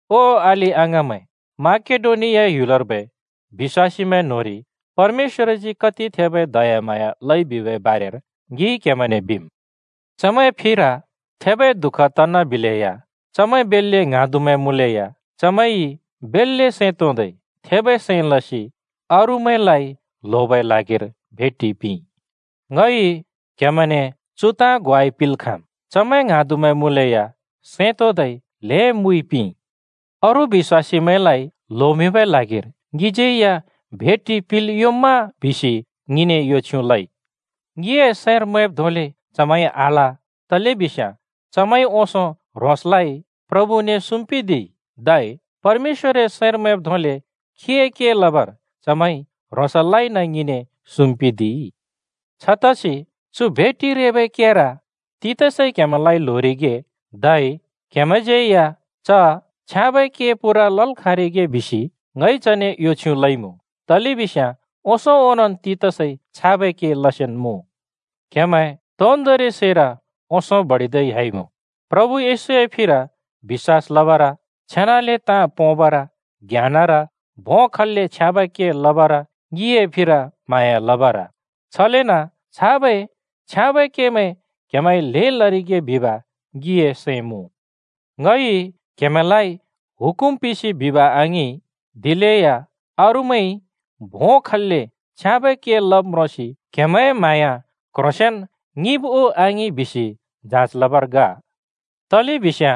ओ अलि-अङाँमैं, माकेडोनिया ह्‍युलर्बै बिश्‍वासीमैं न्‍होंरि परमेश्‍वरजी कति थेबै दयाम्हाँया लइ बिबै बारेर ङिइ क्‍हेमैंने बिम्। चमैंए फिर थेबै दुःख तनबिलेया, चमैं बेल्‍ले ङ्हाँदुमैं मुँलेया चमैंइ बेल्‍ले सैं तोंदै थेबै सैं लसि अरूमैंलाइ ल्होबै ल्हागिर भेटि पिंइ। ङइ क्‍हेमैंने चु ताँ ग्वाइ पिंल् खाँम्: चमैं ङ्हाँदुमैं मुँलेया सैं तोंदै ल्हें मुइ पिंइ। “अरू बिश्‍वासीमैंलाइ ल्होमिंबै ल्हागिर ङिज्‍यै या भेटि पिंल् योंम्मा?” बिसि ङिने यो छ्युँ लइ। ङिए सैंर मैंब् धोंले चमैंइ आल, बरु चमैंइ ओंसों ह्रोंसलाइ प्रभुने सुम्पिदिइ, धै परमेश्‍वरए सैंर मैंब् धोंले खीए के लबर चमैंइ ह्रोंसलाइ ङिने सुम्पिदिइ। छतसि चु भेटि रेबै केर तीतसइ क्हेमैंलाइ ल्होरिगे धै क्हेमैंज्यै च छ्याँबै के पूरा लल् खाँरिगे बिसि ङइ चने यो छ्युँ लइमुँ। तलेबिस्याँ ओंसों ओंनोंन् तीतसइ छाबै के लसेन्मुँ। क्‍हेमैं तोन्दोंरि सैर ओंसों बडिदै ह्‍याइमुँ: प्रभु येशूए फिर बिश्‍वास लबर, छेनाले ताँ पोंबर, ज्ञानर, भों खल्‍ले छ्याँबै के लबर, ङिए फिर म्हाँया लबर। छलेन छाबै छ्याँबै केमैं क्‍हेमैंइ ल्हें लरिगे बिब ङिए सैं मुँ। ङइ क्‍हेमैंलाइ हुकुम पिंसि बिब आङिं, दिलेया अरूमैंइ भों खल्‍ले छ्याँबै के लब् म्रोंसि क्‍हेमैंए म्हाँया क्‍ह्रोंसेंन ङिंब् उ आङिं बिसि जाँच लबर ग। तलेबिस्याँ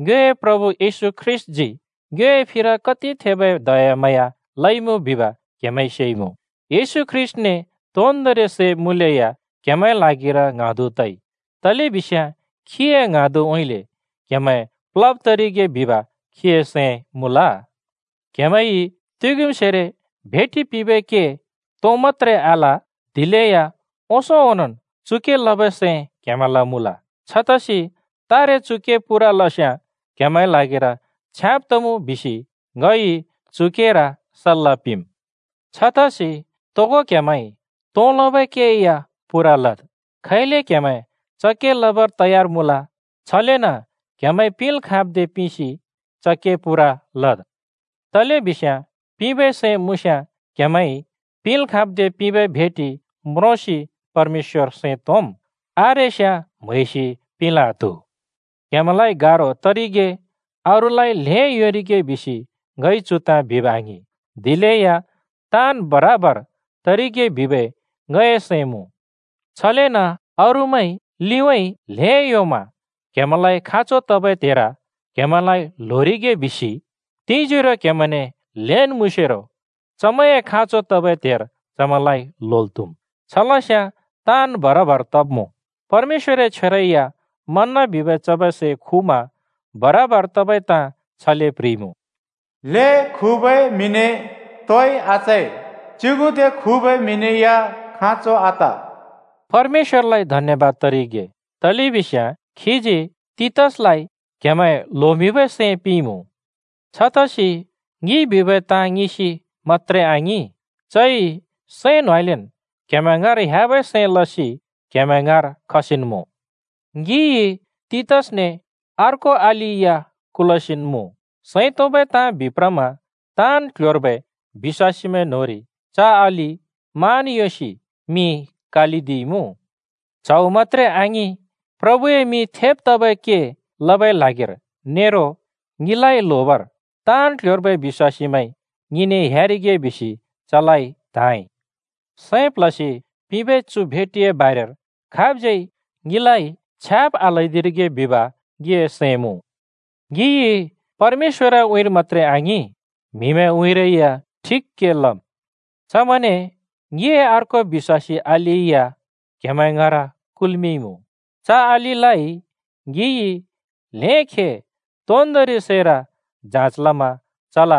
ङ्योए प्रभु येशू ख्रीष्‍टजी ङ्योए फिर कति थेबै दयाम्हाँया लइमुँ बिब क्हेमैंइ सेइमुँ। येशू ख्रीष्‍टने तोन्दोंरि सै मुँलेया क्‍हेमैंए ल्हागिर ङ्हाँदु तइ। तलेबिस्याँ खीए ङ्हाँदुउँइँले क्‍हेमैं प्लब् तरिगे बिब खीए सैं मुँल। क्हेमैंइ तुग्युमसेरो भेटि पिंबै के तों मत्‍त्रे आल, दिलेया ओंसों ओंनोंन् चु के लबै सैं क्हेमैंल मुँल। छतसि तारे चु के पूरा लस्याँ क्हेमैंए ल्हागिर छ्याँब तमुँ बिसि ङइ चु केर सल्‍ला पिंम्। छतसि तोगो क्‍हेमैंइ तों लबै के या पूरा लद्। खैले क्‍हेमैं च के लबर तयार मुँल, छलेन क्‍हेमैंइ पिंल् खाँब् दे पिंसि च के पूरा लद्। तलेबिस्याँ पिंबै सैं मुँस्याँ क्‍हेमैंइ पिंल् खाँब् दे पिंबै भेटि म्रोंसि परमेश्‍वर सैं तोंम्। आरेस्याँ म्हैसि पिंल् आत्हु। क्‍हेमैंलाइ गारो तरिगे अरूलाइ ल्हें योंरिगे बिसि ङइ चु ताँ बिब आङिं, दिलेया ताँन् बराबर तरिगे बिबै ङए सैं मुँ। छलेन अरूमैंइ लिउँइँ ल्हें योंमा क्‍हेमैंलाइ खाँचो तबै त्हेर क्‍हेमैंलाइ ल्होरिगे बिसि तिंजोरो क्‍हेमैंने ल्‍हेन् मुँसेरो चमैंए खाँचो तबै त्हेर चमैंलाइ ल्होल् त्‍हुम्। छलस्याँ ताँन् बराबर तब्‍मुँ। परमेश्‍वरए छ्वेरै या मन्‍ना बिबै चबै सै खुमा बराबर तबै ताँ छले प्ह्रिइमुँ, “ल्हें खुबै म्‍हिने तोइ आचै, च्‍युगुदे खुबै म्‍हिने या खाँचो आत।” परमेश्‍वरलाइ धन्‍यबाद तरिगे, तलेबिस्याँ खीजी तीतसलाइ क्‍हेमैं ल्होमिंबै सैं पिंइमुँ। छतसि ङिइ बिबै ताँ ङिंसि मत्‍त्रे आङिं, चइ सैं न्होंउँइँलेन् क्‍हेमैं ङाँर ह्‍याबै सैं लसि क्हेमैं ङाँर खसिन्मुँ। ङिइ तीतसने अर्को अलि या कुलसिन् मुँ। सैं तोंबै ताँ बिप्रमा ताँन् क्‍ल्‍ह्‍योर्बै बिश्‍वासीमैं न्‍होंरि च अलि मान योंसि मिं कालिदिइमुँ। च्हौ मत्‍त्रे आङिं, प्रभुए मिं थेब् तबै के लबै ल्हागिर नेरो ङिलाइ ल्होबर ताँन् क्‍ल्‍ह्‍योर्बै बिश्‍वासीमैंइ ङिने ह्‍यारिगे बिसि चलाइ त्‍हाँइ। सैं प्ल्हसि पिंबै चु भेटिए बारेर खाबज्यै ङिलाइ छ्याब् आल्हैदिरिगे बिब ङिए सैं मुँ। ङिइ परमेश्‍वरए उँइँर मत्‍त्रे आङिं, म्हिमैंए उँइँरै या ठिक के लम्। चमैंने ङिए अर्को बिश्‍वासी अलि या क्‍हेमैं ङाँर कुल्मिंइमुँ। च अलिलाइ ङिइ ल्हें खे तोन्दोंरि सैर जाँच लमा चल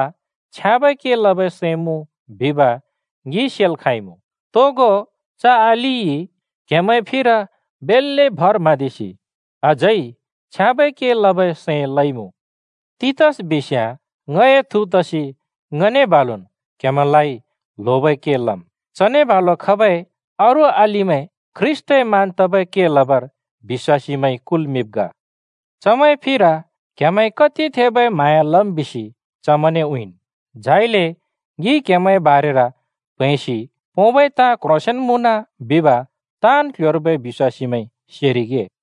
छ्याँबै के लबै सैं मुँ बिब ङिइ सेल् खाँइमुँ। तोगो च अलिइ क्‍हेमैंए फिर बेल्‍ले भर म्हाँदिसि अझै छ्याँबै के लबै सैं लइमुँ। तीतस बिस्याँ ङए थु तसि ङने बालुन् क्हेमैंलाइ ल्होबै के लम्। चने बालु खबै अरू अलिमैं ख्रीष्‍टए मान तबै के लबर बिश्‍वासीमैंइ कुल्मिंब् ग। चमैंए फिर क्हेमैंइ कति थेबै म्हाँया लम् बिसि चमैंने उँइँन्, झाइले ङिइ क्‍हेमैंए बारेर प्हैंसि पोंबै ताँ क्ह्रोंसेंन् मुँन बिब ताँन् क्‍ल्‍ह्‍योर्बै बिश्‍वासीमैंइ सेरिगे।